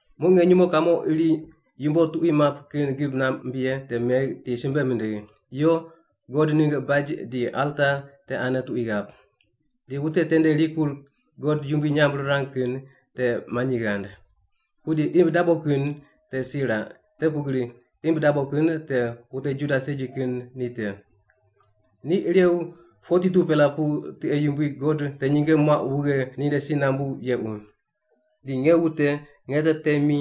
Muq nge nyumo kamo iri yumbo tuqui pap kin gib namb ye te megh di simbe mindigh, “Yo, God ningg baj di alta te ane tuqui ghap. Di wute tende rikur God yumbui nyamb rirang kin te manyi ghand. Pudi imb dabo kin te si raq, te pugri imb dabo kin te wute Juda segi kin ni te. Ni irew 42-pela pu tiqe yumbui God te nyinge muaq wughe ninde si nambu yequ. Di nge wute nge te temi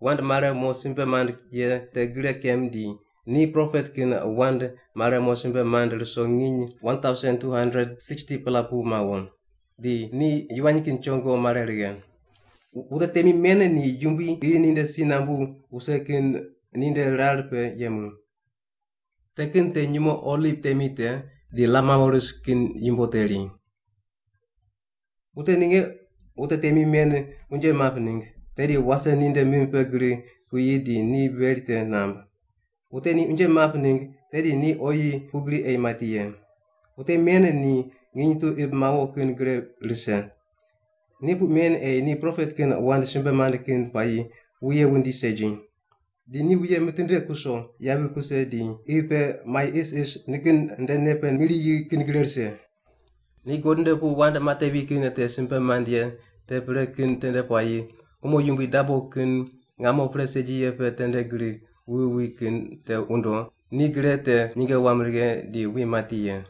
wand mare mo simbe mand ye te gre kem di ni propet kin wand mare mo simbe mand ruso nginy 1,260-pela pu mawo. Di ni yivany kin chongo mare righe.” Wute temi men ni Yumbui qi ninde si nambu wuse kin ninde rar pe yemu. Te kin te nyumo oliv temi te di lam mawo ris kin yumbo teri. Wute ninge wute temi men unje map ningg, tedi wase ninde mim pe gri kuyi di ni veri te namb. Wute ni unje map ningg, tedi ni oyi pugri ei mati ye. Wute men ni nginy tu imb mawo kin gre rise. Ni puq men ei ni propet kin wand simbe mand kin puayi wuye wundi segi. Di ni wuye mitinde kuso yavi kuse di qi pe mai isis nikin nde nei pe mi riyi kin gre rise. Ni God nde pu wand matevi kin te simbe mand ye te pre kin tende puayi umo yumbui dabo kin ngamo pre segi ye pe tende gri wuwi wi kin te wundo, ni gre te nyinge wam righe di wi mati ye.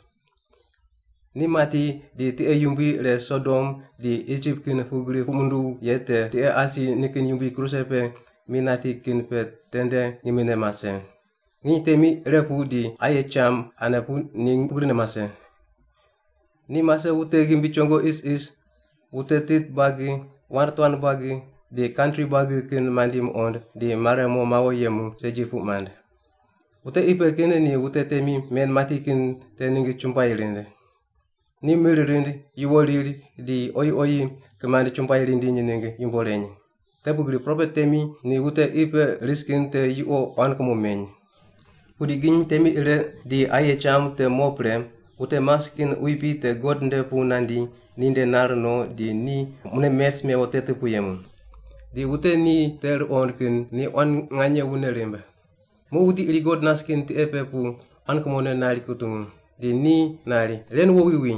Ni mati di tiqe yumbui ire Sodom di Isip kin pugri puq munduw ye te tiqe asi nikin Yumbui kruse pe mi nati kin pe tende ngimne mase. Nginy temi ire pu di aye cham ane pu ni pugrine mase. Ni mase wute ghimbi chongo isis, wute tit buagi, wand tuan buagi, di kantri buagi kin mandi muqond, di mare mo mawo yemu segi puq mand. Wute qi pe kin ni wute temi men mati kin te ningg chumbuai rind. Ni mir rind, yuwo riri di oyi oyi kimand chumbuai rindiny ningg yumbo reny. Te pugri propet temi ni wute qi pe ris kin te yuqo quan kumo meny. Pudi nginy temi ire di aye cham te mo pre, wute mas kin quipi te God nde pu nandi ninde nar no di ni mune mes mewo teti pu yemu. Di wute ni te ruqond kin ni quan nganye wune rimb. Muq wuti iri God nas kin tiqe pe pu quan kumone nari rutungu, di ni nari, “Ren wowi wi.”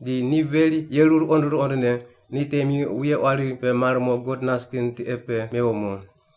Di ni veri yeru ruqond ruqondne ni temi wuye quari pe mar mo God nas kin tiqe pe mewo mo.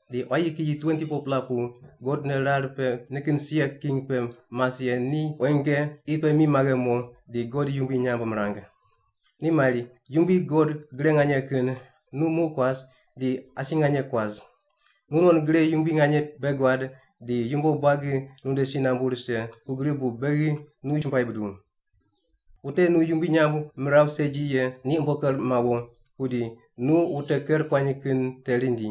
Di quayi kiyi 24-pela pu God nde rar pe nikin sia king pe mas ye ni quenge qi pe mi maghe mo di God yumbui nyamb mirang. Ni mari, “Yumbui God Gre Nganye Kin nu muq kuas di asi nganye kuas. Nu non gre yumbui nganye bei guad di yumbo buagi nunde si nambu rise, pugri bu beghi nu chumbuai buduw. Wute nu yumbui nyamb miraw segi ye ni umbo ker mawo, pudi nu wute ker kuany kin te rindi.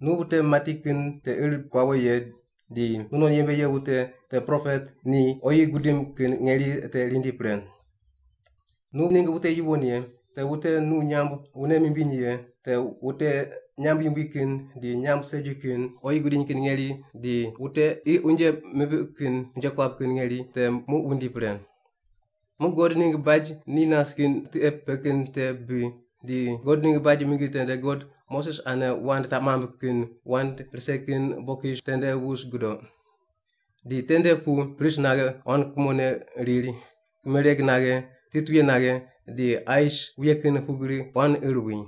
Nu wute mati kin te ir kuawo ye di nunon yembe ye wute, te propet, ni oyi gudim kin ngeri te rindi pre. Nu ningg wute yuwon ye, te wute nu nyamb wune mimbiny ye, te wute nyamb yumbui kin di nyamb segi kin, oyi gudiny kin ngeri, di wute qi unje mipiq kin unje kuap kin ngeri te muq wundi pre.” Muq God ningg baj ni nas kin tiqe pe kin te bi, di God ningg baj mingi tende God Moses ane wand taq mamb kin wand rise ye bokis tende wus gudoq. Di tende pu pris naghe quan kumone riri, kimereg naghe, titwuye naghe, di ais wuye kin pugri quan ir wi.